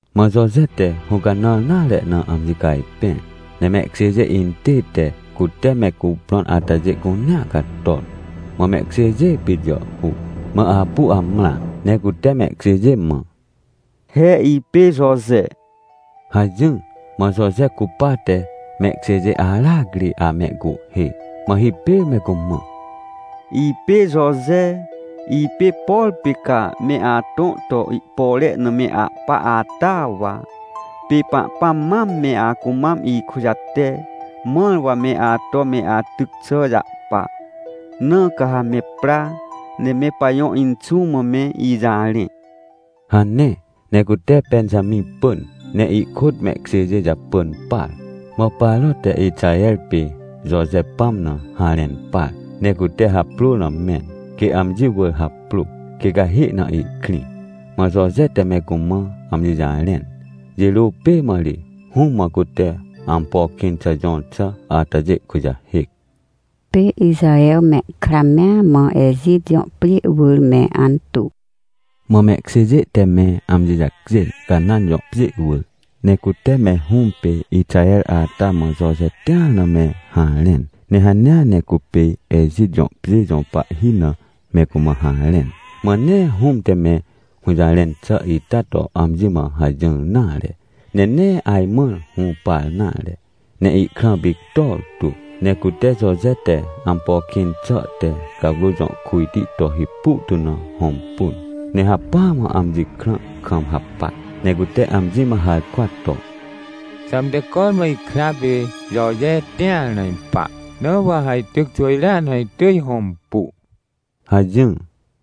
Mã Joje te hũcanãr nare na amji cajpẽr, ne mehkjêjê intête, cute me cuprõn atajê cunea cator, mã mehkjêjê pit jàhhuc. Mã apu amrã ne cute mehkjêjê mã: — He ipê Joje — hajỹr. Mã Joje cupate mehkjêjê aracri amehcuhhê. Mã hipêr me cumã: — Ipê Joje, ipê, por pê ca me atõ to ihpore na me ahpa ata wa. Pê Pahpãm mam me acumam ikujate, mãr wa me ato me atyc xà jahpa. Na ca ha me pra, ne me pajõ inxũ mã me ijarẽ — hane. Ne cute Pẽnjamĩ pỳn, ne ihkôt mehkjêjê japỳn par. Mã Paro te Ixaher pê Joje pãm na harẽn par, ne cute haprôr na mẽn, quê amji wỳr haprô quê cahê na ihkrĩ. Mã Joje te me cumã amji jarẽn jirô pê mã ri, hũm mã cute ampo kĩn xà jõr xà atajê kujahêc. Pê Ixaher mehkra mea mã Ejit jõ pjê wỳr me antuw Mã mehkjêjê te me amji jacjên, Canãn jõ pjê wỳr, ne cute me hũm pê Ixaher ata mã Joje tĩar na me harẽn. Ne hanea ne cupê Ejit jõ pjê jõ pahhi na me cumã harẽn. Mã nee hũm te me hũjarẽn xà ita to amji mã hajỹr nare, ne nee ajmãr hũpar nare, ne ihkrã pictor tu. Ne cute Joje te ampo kĩn xà te cawrô jõ kujti to hipu tu na hõmpun, ne hacpỹa mã amji krã kam hapac. Ne cute amji mã harkwa to: — Xãmte cormã ikra pê Joje tĩar na ipa, na wa ha ityc xwỳjrea na itỳj hõmpu — hajỹr.